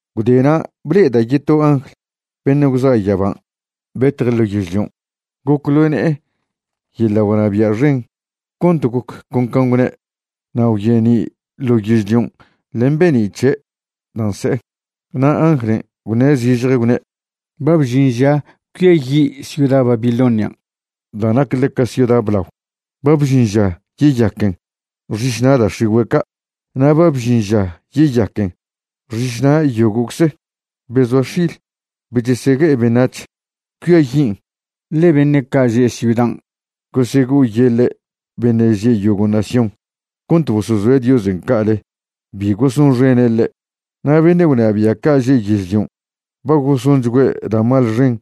Gwdena' ble'eda' yeto angl beṉe' gwza' yaban' betje' ḻo yežlion'. Goc ḻo ne'e yeḻa' gwnabia' xen cont goc con can' gwne', na' gwyeni' ḻo yežlion' len be'ni' c̱he' da' nse'e. Na' anglen' gwṉe' zižje, gwne': ―Ba bžin ža cuiayi' ciuda Babilonian' da' nac ḻeca ciuda blao. Ba bžin ža yeyaquen xišna' da' x̱igüe' ca'. Na' ba bžin ža yeyaquen xišna' yogo'cze be zoa x̱il be chesegue'e beṉac̱h. Cuiayin', ḻe beṉe' ca' že' ciudan' gosego'oyeḻe' beṉe' že' yogo' nación cont bosozoe' Diosen' ca'aḻe bi gosonxene' ḻe'. Na' beṉe' gwnabia' ca' že' yežlion' ba gosonchgüe' da' mal txen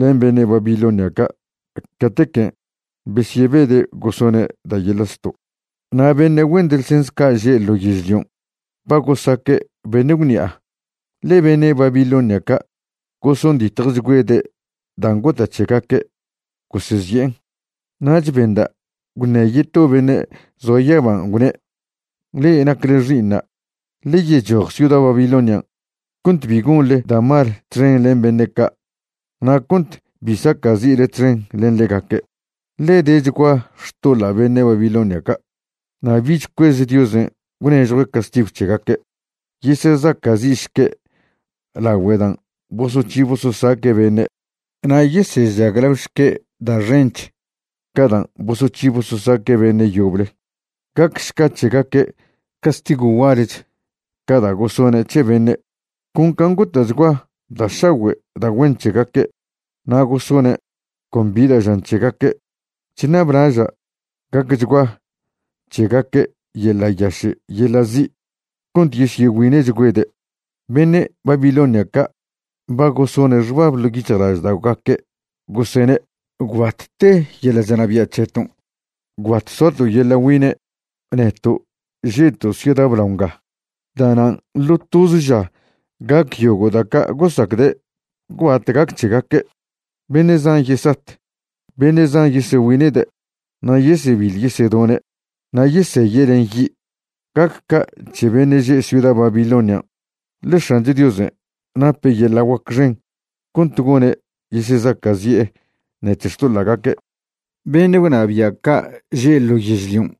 len beṉe' Babilonia ca' catequen' besyebede' gosone' da' yeḻa' zto', na' beṉe' güen delgens ca' že' ḻo yežlion' ba gosaque' beṉe' gwṉi'a, ḻe beṉe' Babilonia ca' gosonditjchgüede' dan' gota' c̱hegaque' gosezi'en. Nach benda' gwṉe yeto beṉe' zoa yaban', gwne': ―Le'e nacle xi'iṉa', ḻe yechoj ciuda Babilonian' cont bi gonḻe da' mal txen len beṉe' ca' na' cont bi saca'zi'le txen len ḻegaque', ḻe dechgua xtoḻa' beṉe' Babilonia ca', na' bich cuez Diosen' gwnežjue' castigw c̱hegaque'. Yesezaca'zi'šque' lagüe dan' bosoc̱hi bososaque' beṉe', na' yesežaglaošque' da' xench ca dan' bosoc̱hi bososaque' beṉe' yoble. Gacšca c̱hegaque' castigw gualech ca da' gosone' c̱he beṉe'. Con can' gota'chgua da' šagüe' da' güen c̱hegaque' na' gosone' con bi da' žan c̱hegaque', chṉablaža' gacchgua c̱hegaque' yeḻa' yaše' yeḻa' zi' cont yesyegüine'chgüede'. Beṉe' Babilonia ca' ba gosone' xbab ḻo' yic̱hjlažda'ogaque' gosene': “Gwbat te yeḻa' chnabia' c̱heton'; gwbat soato' yeḻa' güine', neto' že'to' ciuda blao nga.” Da'nan' ḻo toze ža gac yogo' da' ca' gosacde' gwbat gac c̱hegaque'. Beṉe' zan yesat, beṉe' zan yesegüine'de', na' yesebiḻ yesedone', na' yeseye' len yi'. Gac ca' c̱he beṉe' že' ciuda Babilonian', ḻe X̱ancho Diosen' nape' yeḻa' guac xen cont gone' yesezaca'zi'e ṉec̱he xtoḻa'gaque'. Beṉe' gwnabia' ca' že' ḻo yežlion'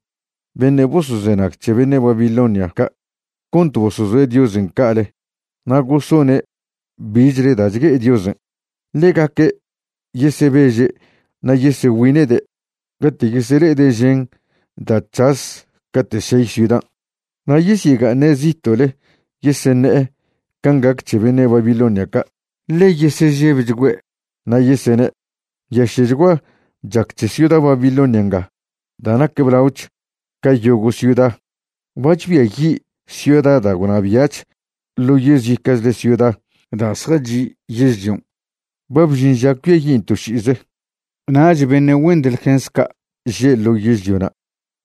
beṉe' bosozenag c̱he beṉe' Babilonia ca' cont bosozoe' Diosen' ca'ale na' gosone' bichle da' chgue'e Diosen', ḻegaque' yesebeže' na' yesegüine'de' cate' yesele'ede' žen da' c̱has cate' šey ciudan'. Na' yesyega'aṉe' zito'le yeseṉe'e can' gac c̱he beṉe' Babilonia ca', ḻe yesežebchgüe'. Na' yesene': ―¡Nyaše'chgua chac c̱he ciuda Babilonia nga da' nac blaoch ca yogo' ciuda! Ba chbiayi' ciuda da' gwnabia'ch ḻo yezica'chle ciuda da' zjachi' yežlion'. Ba bžin ža cuiayin' to ši'ize. Nach beṉe' güen delgens ca' že' yežliona'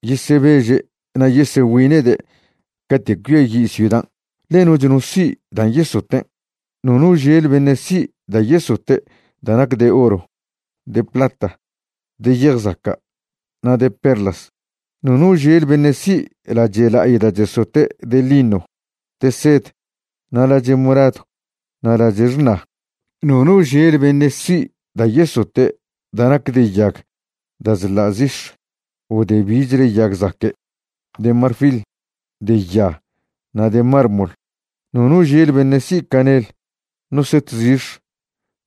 yesebeže' na' yesegüine'de' cate' cuiayi' ciudan', ḻe noch no si' dan' yesoten'. Nono žel beṉe' si' da' yesote' da' nac de oro, de plata, de yej zaca', na' de perlas. Nono žel beṉe' si' lache' la'ay da' chesote' de lino, de sed, na' lache' moradw na' lache' xṉa. Nono žel beṉe' si' da' yesote' da' nac de yag da' chḻa' zix̱ o de bichle yag zaque', de marfil, de ya na' de mármol. Nono žel beṉe' si' canel, no set zix̱,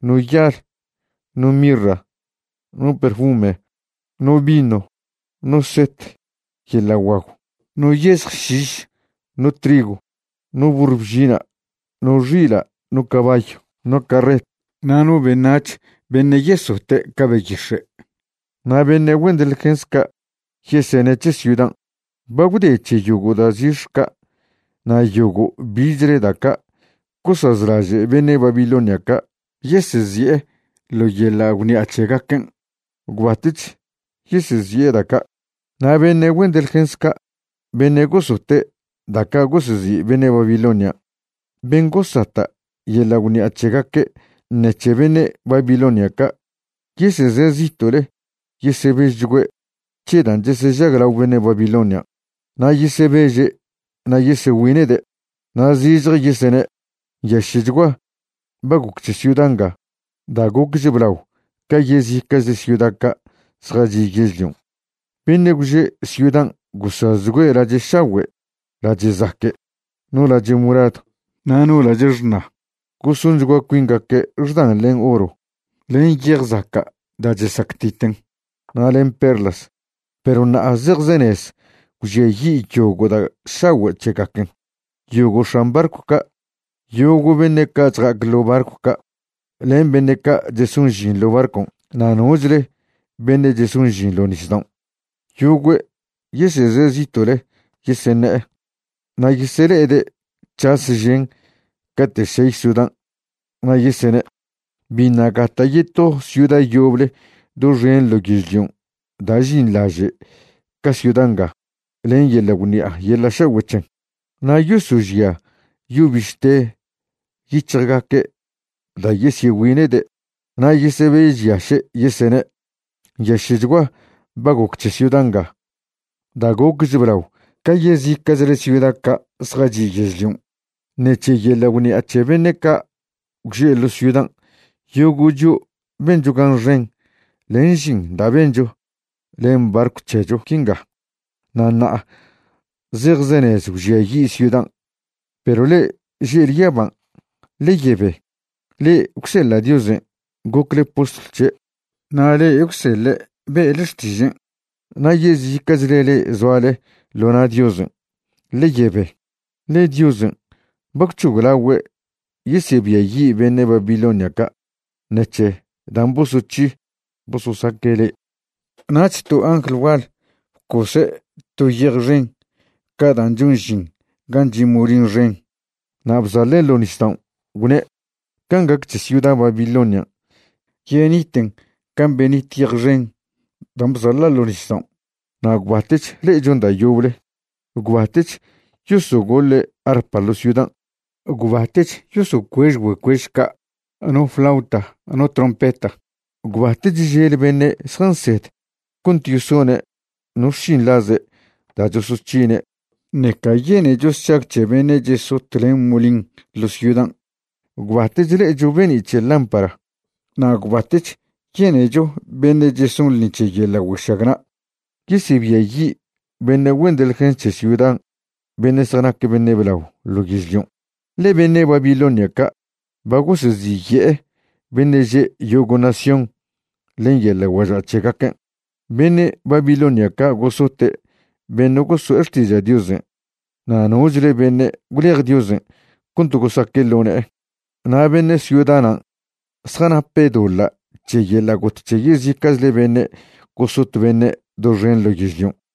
no yal, no mirra, no perfume, no vino, no set yeḻa' guagw, no yezj šiš, no trigw, no burr bžina', no xila', no cabayw, no carret, na' no beṉac̱h beṉe' yesote' ca beyix̱e'. Na' beṉe' güen delgens ca' yesene' c̱he ciudan': ―Ba gwde c̱he yogo' da' zix̱ ca' na' yogo' bichle da' ca' gosazlaže' beṉe' Babilonia ca' yesezi'e ḻo yeḻa' gwṉi'a c̱hegaquen'. Gwbatech yesezi'e da' ca'. Na' beṉe' güen delgens ca' beṉe' gosote' da' ca' gosezi' beṉe' Babilonian', ben' gosata' yeḻa' gwṉi'a c̱hegaque' ṉec̱he beṉe' Babilonia ca', yeseze' zito'le yesežebchgüe' c̱he dan' chesežaglao beṉe' Babilonian'. Na' yesebeže' na' yesegüine'de', na' zižje yesene': ―¡Nyaše'chgua ba goc c̱he ciuda nga da' gocch blao ca yezica'chle ciuda ca' zjachi' yežlion'! Beṉe' gwže' ciudan' gosazchgüe' lache' šagüe' lache' zaque', no lache' moradw na' no lache' xṉa. Gosonchgua cuingaque' xdan len oro, len yej zaca' da' chesactiten, na' len perlas. Perw ṉa'a zejzenez gwžiayi' yogo' da' šagüe' c̱hegaquen'. Yogo' x̱an barcw ca', yogo' beṉe' ca' chja'ac ḻo' barcw ca', len beṉe' ca' cheson žin ḻo' barcon' na' nochle beṉe' cheson žin ḻo nisdaon', yogüe' yeseze zito'le yeseṉe'e. Na' yesele'ede' c̱has žen cate' šey ciudan' na' yesene': ―Biṉa' gata' yeto ciuda yoble doxen ḻo yežlion' da' žinḻaže' ca ciuda nga len yeḻa' gwṉi'a yeḻa' šagüe' c̱hen. Na' yosožia yo bište yic̱hjgaque' da' yesyegüine'de', na' yesebežyaše', yesene': ―¡Nyaše'chgua ba goc c̱he ciuda nga da' gocch blao ca yezica'chle ciuda ca' zjachi' yežlion'! Ṉec̱he yeḻa' gwṉi'a c̱he beṉe' ca' gwže' ḻo ciudan' yogo' chio' bencho gan xen len žin da' bencho len barcw c̱hecho quinga. Na' ṉa'a zejzenez gwžiayi' ciudan'. Perw le'e že'le yaban', ḻe yebe. Le'e gwseḻa' Diosen' gocle postlw c̱he', na' le'e gwseḻe' be'le xtižen', na' yezica'chle le'e zoale ḻo na' Diosen', ḻe yebe. Ḻe Diosen' ba gwc̱hoglagüe' yesebiayi' beṉe' Babilonia ca' ṉec̱he dan' bosoc̱hi bososaque' le'e. Nach to angl gual bcose' to yej xen ca dan' chon žin gan' chi' molin xen, na' bzaḻen' ḻo' nisdaon', gwne': ―Can' gac c̱he ciuda Babilonian', yeniten can' benit yej xen dan' bzaḻa' ḻo' nisdaon', na' gwbatech le'echon da' yoble. Gwbatech yosogoḻe' arpa ḻo ciudan'; gwbatech yosocuež güecuež ca' no flauta no trompeta. Gwbatech žel beṉe' zjansed cont yesone' no xšinḻaze' da' chosoc̱hine', ṉeca yenecho sšag c̱he beṉe' chesot len molin ḻo ciudan'. Gwbatech le'echo be'ni' c̱he lámpara, na' gwbatech yenecho beṉe' cheson ḻṉi c̱he yeḻa' güešagna'. Yesebiayi' beṉe' güen delgens c̱he ciudan' beṉe' zjanac beṉe' blao ḻo yežlion', ḻe beṉe' Babilonia ca' ba goseziye'e beṉe' že' yogo' nación len yeḻa' güaža' c̱hegaquen'. Beṉe' Babilonia ca' gosote' beṉe' goso'e xtiža' Diosen' na' nochle beṉe' gwlej Diosen' cont gosaque' ḻo ne'e, na' beṉe' ciuda nan' zjanape' doḻa' c̱he yeḻa' got c̱he yezica'chle beṉe' gosot beṉe' doxen ḻo yežlion'.